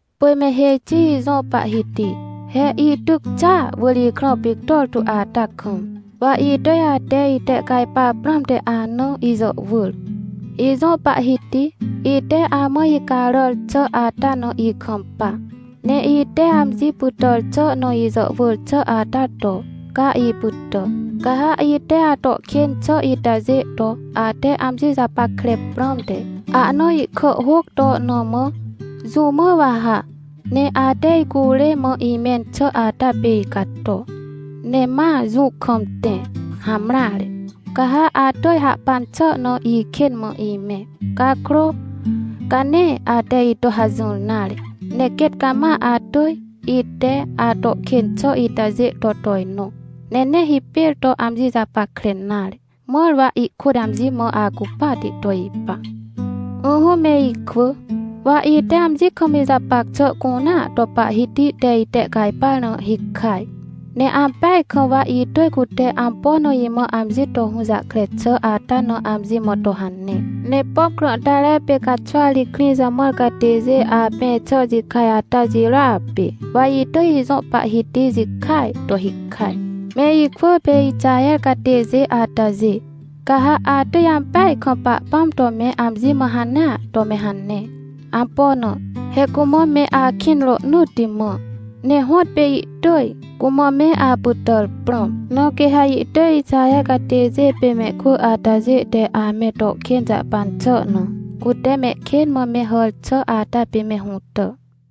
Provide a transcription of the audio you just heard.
Pỳj me hêj xi ijõ Pahhiti! He ityc xàa wỳr ikrã pictor tu ata kam, wa itỳj ate itehcajpar prãmte ana ijàhwỳr. Ijõ Pahhiti, ite amã icaràr xà ata na ikampa! Ne ite amji pytàr xà na ijàhwỳr xà ata to, ca ipytà! Ca ha ite ato kên xà itajê to, ate amji japackre prãmte ahna ihkàhhôc to na mã, jũ mã wa ha, ne ate icurê mã imẽn xà ata pê icato, ne ma jũ kam tẽ? Hamreare! Ca ha atỳj hahpan xà na ikên mã imẽ. Cakrô, ca nee ate ito hajỹr nare. Ne quêt cama atỳj, ite ato kên xà itajê to tojnõ, ne nee hipêr to amji japackre nare, mãr wa ihkôt amji mã acupahti to ipa. Ỹhỹ me ikwỳ, wa ite amji kam ijapac xà cunea to Pahhiti te itehcajpar na hikaj. Ne ampeaj kam wa itỳj cute ampo na imã amji to hũjahkre xà ata na amji mã to hane. Ne pom krãhtare pê caxwari krĩ jamãr catêjê apẽ xà jikaj ata jirôa pê, wa itỳj ijõ Pahhiti jikaaj to hikaj. Me ikwỳ pê Ixaher catêjê atajê, ca ha atỳj ampeaj kam Pahpãm to me amji mã hanea to me hane. Ampo na? He cumã me akĩn rohnỳtti mã, ne hõtpê ihtỳj cumã me apytàr prãm. Na quê ha ihtỳj Ixaher catêjê pê mehkwỳ atajê te ame to kên jahpan xà na, cute mehkên mã me hàr xà ata pê me hũtà.